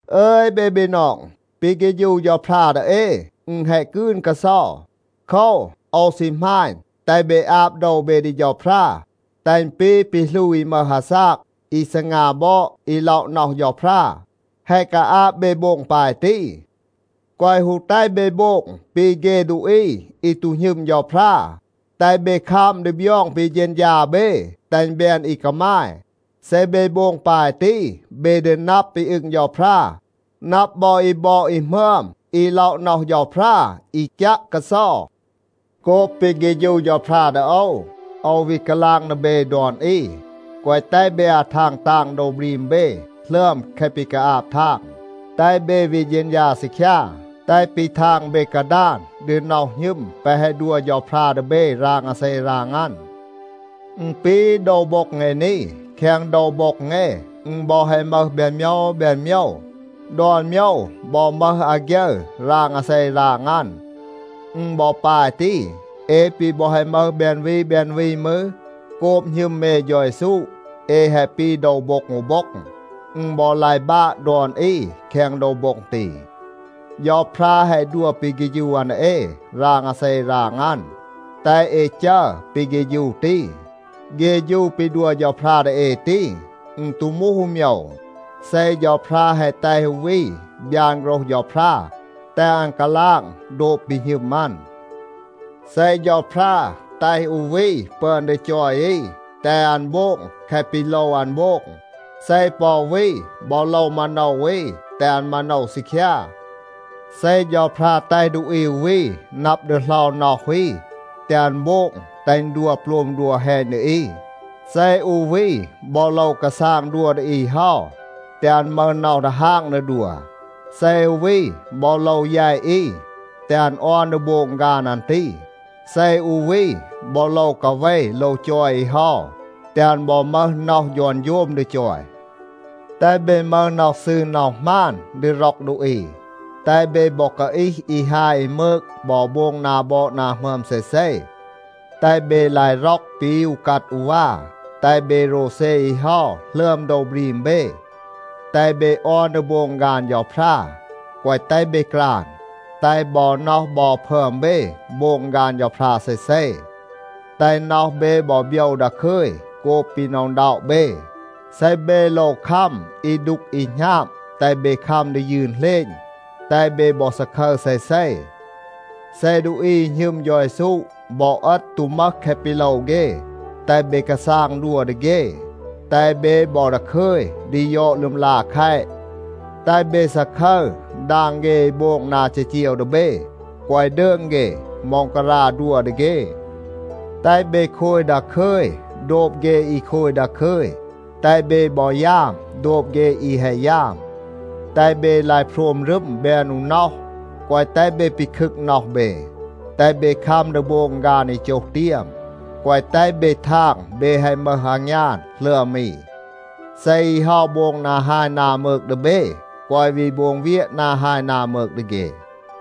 อึย เบ บีนอง, ปี เฆฌู เฌาพรา ดี เอ, อึณ แฮะ กืน กาเซา. โคว, โอว ซี หมาณ, แตห เบ อาบ โดว เบ ดี เฌาพรา, แตห อึณ ปี ปี หลู อี มึห อาซาก, อี ซีงา บอด อี ล็อะ น็อห เฌาพรา. แฮะ กาอาบ เบ โบง ปาย ตี. แกวะ ฮู แตห เบ โบง ปี เฆ ดูอี อี ตู หณึม เฌาพรา. แตห เบ คัม ดี บยอง ปี เฌณฌา เบ, แตห อึณ แบน อี กามาย. เซ เบ โบง ปาย ตี, เบ ดี นับ ปี อึง เฌาพรา, นับ บอ อี บอด อี หมึอม อี ล็อะ น็อห เฌาพรา อี กยัะ กาเซา. โกบ ปี เฆฌู เฌาพรา ดี โอว, โอว วี กาลาง ดี เบ ดอน อี, แกวะ แตห เบ อาทาง ตาง โดว บรีม เบ หลึอม แคะ ปี กาอาบ ทาง. แตห เบ วี เฌณฌา ซีคยา, แตห ปี ทาง เบ กาดาน ดี น็อห หณึม แปะ แฮะ ดัว เฌาพรา ดี เบ ราง อาเซ ราง อัน. อึณ ปี โดว โบ็ง เอ นี. แคง โดว โบ็ง เอ, อึณ บอ แฮะ มึห แบน โมยว แบน โมยว. ดอน โมยว บอ มึห อาฆยึร ราง อาเซ ราง อัน. อึณ บอ ปาย ตี, เอ ปี บอ แฮะ มึห แบน วี แบน วี มืร, โกบ หณึม เอ เฌา เยซู เอ แฮะ ปี โดว โบ็ง อู โบ็ง. อึณ บอ ลาย บาะ ดอน อี แคง โดว โบ็ง ตี. เฌาพรา แฮะ ดัว ปี เฆฌู อัน ดี เอ ราง อาเซ ราง อัน. แตห เอ จัร ปี เฆฌู ตี. เฆฌู ปี ดัว เฌาพรา ดี เอ ตี, อึณ ตู มูห อู โมยว. เซ เฌาพรา แฮะ แตห อู วี บยาน โฆรห เฌาพรา, แตห อัน กาลาง โดบ ปี หณึม อัน. เซ เฌาพรา แตห อู วี ปึอน ดี จอย อี, แตห อัน โบง แคะ ปี โลว อัน โบง. เซ ปอ อู วี บอ โลว มาโนว อี, แตห อัน มาโนว ซีคยา. เซ เฌาพรา แตห ดูอี อู วี นับ ดี เหลา น็อห อี, แตห อัน โบง, แตห อึณ ดัว โปลม ดัว แฮณ ดี อี. เซ อู วี บอ โลว กาซาง ดัว ดี อี เฮา, แตห อัน มึห น็อห ดีฮาง ดี ดัว. เซ อู วี บอ โลว แยต อี, แตห อัน ออน ดี โบง ฆาน อัน ตี. เซ อู วี บอ โลว กาเว โลว จอย อี เฮา, แตห อัน บอ มึห น็อห ฌอนโฌม ดี จอย. แตห เบ มึห น็อห ซืร น็อห หมาน ดี ร็อก ดูอี. แตห เบ บอ กาอีห อี ฮาย อี มืก บอ โบง นา บอด นา หมึอม เซเซ. แตห เบ ลาย ร็อก ปี อู กัด อู วา. แตห เบ โรวเซ อี เฮา หลึอม โดว บรีม เบ. แตห เบ ออน ดี โบง ฆาน เฌาพรา. แกวะ แตห เบ กราน. แตห บอ น็อห บอ พึอม เบ โบง ฆาน เฌาพรา เซเซ. แตห น็อห เบ บอ โบยว ดาคึย โกบ ปี หน็อะ อึณด็อะ เบ. เซ เบ โลว คัม อี ดูก อี หณาบ, แตห เบ คัม ดี ยืน เหลณ. แตห เบ บอ ซาคึร เซเซ. เซ ดูอี อี หณึม เฌา เยซู บอ เอต ตู มึห แคะ ปี โลว เฆ, แตห เบ กาซาง ดัว ดี เฆ. แตห เบ บอ ดาคึย ดี ยอด ลึมลา แคต. แตห เบ ซาคึร ดาง เฆ อี โบง นา จีจีว ดี เบ. แกวะ ดืง เฆ, ม็องการา ดัว ดี เฆ. แตห เบ โคย ดาคึย โดบ เฆ อี โคย ดาคึย. แตห เบ บอ ยาม โดบ เฆ อี แฮะ ยาม. แตห เบ ลาย โพรม รึม แบน อู น็อห. แกวะ แตห เบ ปีคึก น็อห เบ. แตห เบ คัม ดี โบง ฆาน อี โจห เตียม. แกวะ แตห เบ ทาง เบ แฮะ มึห อางยาน หลึอม อี. เซ อี เฮา โบง นา ฮาย นา มืก ดี เบ, แกวะ วี โบง เวียะ นา ฮาย นา มืก ดี เฆ.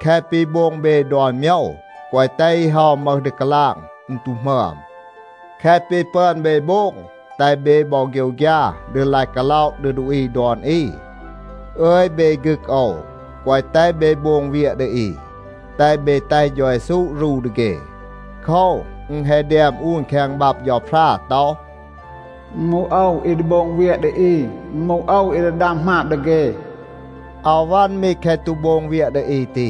แคะ ปี โบง เบ ดอน โมยว, แกวะ แตห อี เฮา มึห ดี กาลาง, อึณ ตู หมึอม. แคะ ปี ปึอน เบ โบง, แตห เบ บอ โฆยวฆยา ดี ลาย กาล็อะ ดี ดูอี ดอน อี. อึย เบ ฆึก โอว, แกวะ แตห เบ โบง เวียะ ดี อี. แตห เบ แตห เฌา เยซู รู ดี เฆ. โคว, อึณ แฮะ แดม อูน แคง บับ เฌาพรา ต็อห, “อึณ มูห โอว, อี ดี โบง เวียะ ดี อี. อึณ มูห โอว, อี ดี ดัม หมาบ ดี เฆ.” อาว วัน มี แคะ ตู โบง เวียะ ดี อี ตี.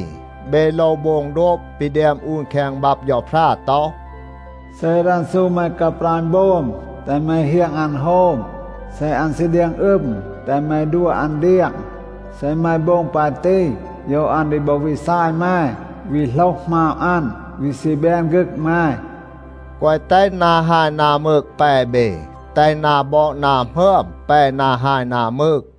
เบ โลว โบง โดบ ปี แดม อูน แคง บับ เฌาพรา ต็อห, “เซ รันซู แม กาปราณ โบม, แตห แม เฮียง อัน โฮม. เซ อัน ซี เดียง อึม, แตห แม ดัว อัน เดียง. เซ แม โบง ปาย ตี, โยว อัน ดี บอ วี ซาย แม, วี โหลห หมาบ อัน, วี ซี แบน ฆึก แม.” แกวะ แตห นา ฮาย นา มืก แป เบ, แตห นา บอด นา หมึอม แป นา ฮาย นา มืก.